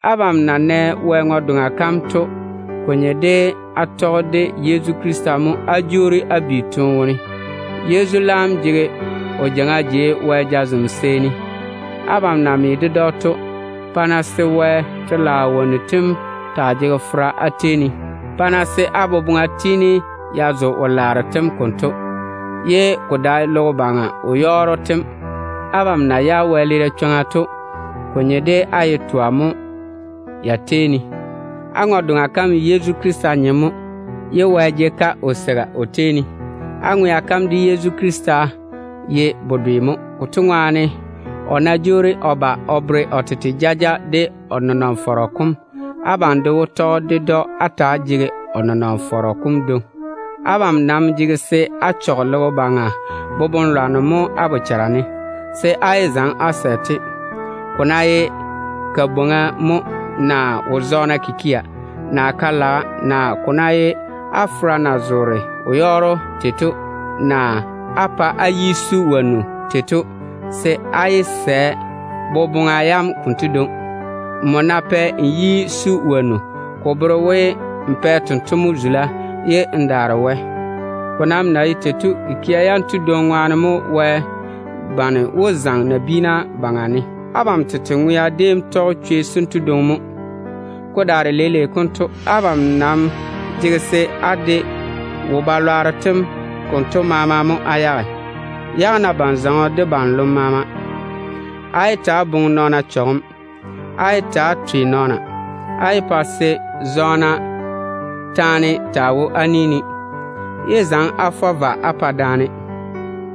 Abam na nɛ Wɛ ŋwe-doŋa kam to, ko nye de á tɔge de Yezu Krista mo á jwoori á bi toone wone. Yezu laam jege o jeiŋa jei Wɛ jazem seeni. Abam na me ded‑o to, pa-na se Wɛ telaao wonnu tem taa jege fera á tei ne. Pa-na se á boboŋa tiini ya zo wo-laaro tem konto, ye ko dae logo baŋa wo-yɔɔro tem. Abam na yage wɛleera chwoŋa to, ko nye de á ye twa mo ya tei ne. Á ŋwe-doŋa kam ye Yezu Krista nyem mo, ye Wɛ jege-ka o kwola o tei ne. Á ŋwea kam de Yezu Krista ye bedwe mo. Konto ŋwaane, o ná jwoori o ba o bere o tete jaja de o nenɔŋ-fɔrɔ kom, abam de wó tɔge ded‑o á ta‑á jege o nenɔŋ-fɔrɔ kom dwoŋi. Abam nam jege se á chɔge logo baŋa boboŋ-lwanno mo á bochara ne, se á daa yé zaŋe á sɛ-te. Ko ná ye kabwoŋa mo, naa wo-zɔɔna keim, naa ka-laga kikia, naa ko ná ye á fera na zoore wo-yɔɔro tei, naa á yi su wonnu tei to, se á yé sɛ á tɔge boboŋa yam konto dwoŋi. Nmo nam ná pae n yi su wonnu, ko bere we n pa tento mo zula ne jwona tei to. Ko nam na ye tei to, kikia yanto dwoŋi ŋwaane mo Wɛ bane wó zaŋe nabiina baŋa ne. Abam tete ŋwea déem tɔge chwei sento dwoŋi mo. Ko daare leile konto, abam nam jege se á de wo-balwaaro tem konto maama mo á yage. Yage-na ban-zɔŋɔ de ban-lom maama. Á yé ta‑á boŋe nɔɔna chɔgem. Á yé ta‑á twe nɔɔna. Á yé pa se ta-zɔɔna taa wo á ni ne. Yé zaŋe-na á fɔ vwa á pa daane.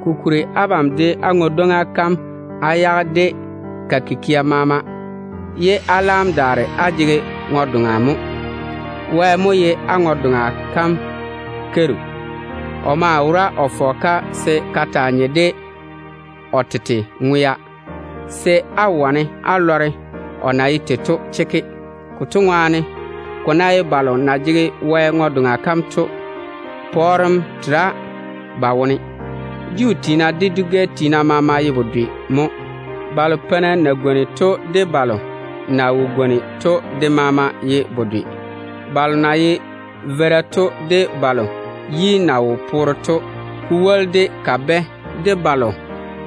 Kokuri abam dole á ŋwe-dwoŋa kam á yage de ka kikia maama, ye á laam daare á jege ŋwe-doŋa mo. Wɛ mo ye á ŋwe-doŋa kam keiru. O maa wora o fɔge-ka se ka taa nye de o tete ŋwea, se á wane á lɔre o na ye tei to chekke. Konto ŋwaane, ko ná ye balo na jege Wɛ ŋwe-doŋa kam to, pɔɔrem tera ba wone. Juu tiina de dwi-gɛ tiina maama ye bedwe mo. Balo peina na gwoni to de balo na wo gwoni to de maama ye bedwe. Balo na ye veira to de balo yi na wo poore to, ko woli de kabɛ de balo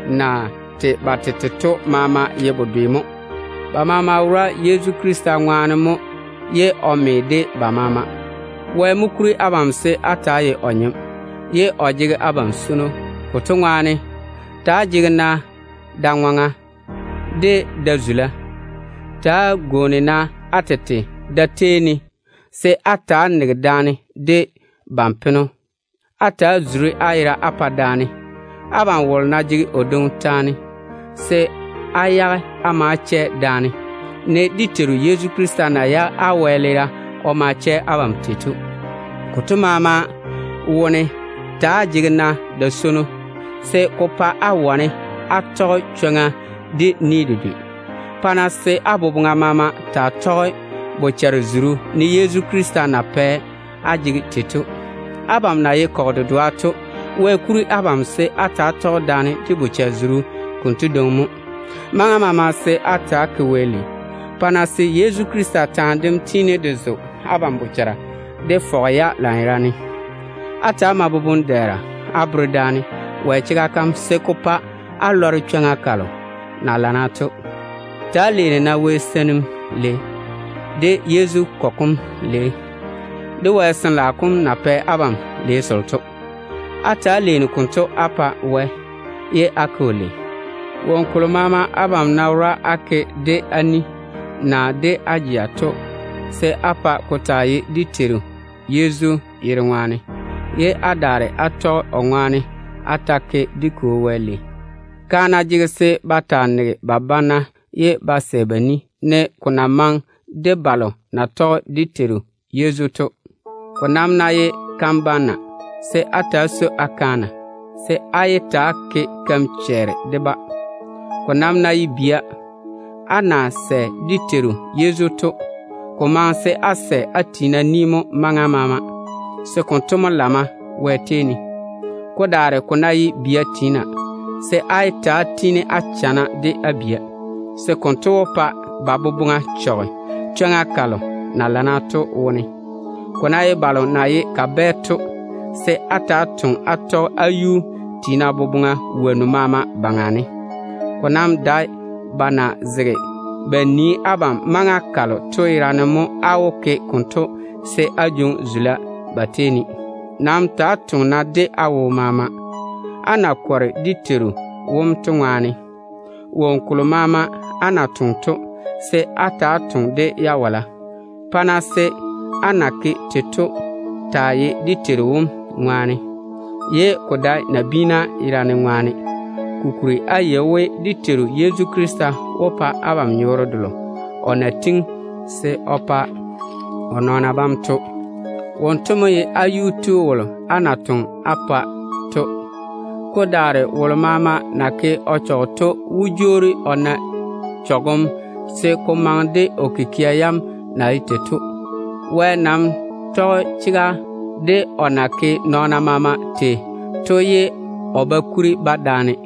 na tei ba tete to maama ye bedwe mo. Ba maama ŋwea wora Yezu Krista ŋwaane mo ye o me de ba maama. Wɛ mo kuri abam se á ta‑á ye o nyem, ye o jege abam swono. Konto ŋwaane, ta‑á jege-na da-ŋwaŋa, de da-zula. Ta‑á gwooni-na á tete da-tei ne, se á ta‑á nege daane de ban-peno. Ta‑á zuri-na á yera á pa daane. Abam wolo ná jege o dwoŋi taane, se á yage á ma á chɛ daane, ne dé Teiru Yezu na yage abam wɛleera o ma chɛ abam tei to. Konto maama wone ta‑á jege-na da-swono, se ko pa á wane á tɔge chwoŋa de ni dedwe. Pa-na se á boboŋa maama taa tɔge bochare-zuru, ne Yezu Krista na pɛ á jege tei to. Abam na ye kɔgɔ dedoa to, Wɛ kuri abam se á ta‑á tɔge daane de bochare-zuru konto dwoŋi mo. Maŋa maama se á ta‑á ke Wɛ lei. Pa-na se Yezu Krista taane dem tiini de zo abam bochara de fɔge-ya lanyerane. Á ta‑á mae boboŋ-dɛɛra á bere daane Wɛ chega kam, se ko pa á lɔre chwoŋa kalo na lana to. Ta‑á leeni-na Wɛ seinim lei, de Yezu kɔgɔ kom lei, de Wɛ Sin-laao kom na pɛ abam lei selo to. Ta‑á leeni-na konto á pa Wɛ, ye á ke‑o lei. Woŋo kolo maama abam na wora á ke de á ni, naa de á jeŋa to, se á pa ko taa ye dé Teiru Yezu yere ŋwaane, ye á daare á tɔge o ŋwaane á ta‑á ke dé Kwo Wɛ lei. Kaana jege se ba sɛ ba pa ba banna, ne ko na maŋe de balo na tɔge dé Teiru Yezu to. Ko nam ná ye kan-banna, se á ta‑á swoi á kaana, se á yé ta‑á ke keim-chɛɛre de-ba. Ko nam ná ye bia, á na sɛ dé Teiru Yezu to, ko maŋe se á sɛ á tiina ni mo maŋa maama, se konto mo lamma Wɛ tei ne. Ko daare ko ná ye bia tiina, se á yé ta‑á chuchugi á bia bana, se konto wó pa ba boboŋa chɔge chwoŋa kalo na lana to wone. Ko ná ye balo na ye kabɛ to, se á ta‑á toŋe á tɔge á yuu tiina boboŋa woŋo maama baŋa ne. Ko nam dae ba na zege ba nii abam maŋa kalo to yerane mo á wó ke konto se á jwoŋi zula ba tei ne. Maŋa maama ta‑á toŋe-na de á wo maama, á na kɔre dé Teiru wom to ŋwaane. Woŋo kolo maama á na toŋe to, se á ta‑á toŋe de jawala. Pa-na se á na ke tei to taa ye dé Teiru wom ŋwaane, ye ko dae nabiina yerane ŋwaane. Kokuri á yei we dé Teiru Yezu Krista wó pa abam nyɔɔre delo o na tiŋi se o pa o nɔɔna bam to. Wonto mo ye á yuu tu wolo á na toŋe á pa to. Ko daare wolo maama na ke o chɔge to wó jwoori o na chɔgem se ko maŋe de o kikia yam na ye tei to. Wɛ nam tɔge chega de o na ke nɔɔna maama tei to ye o ba kuri-ba daane.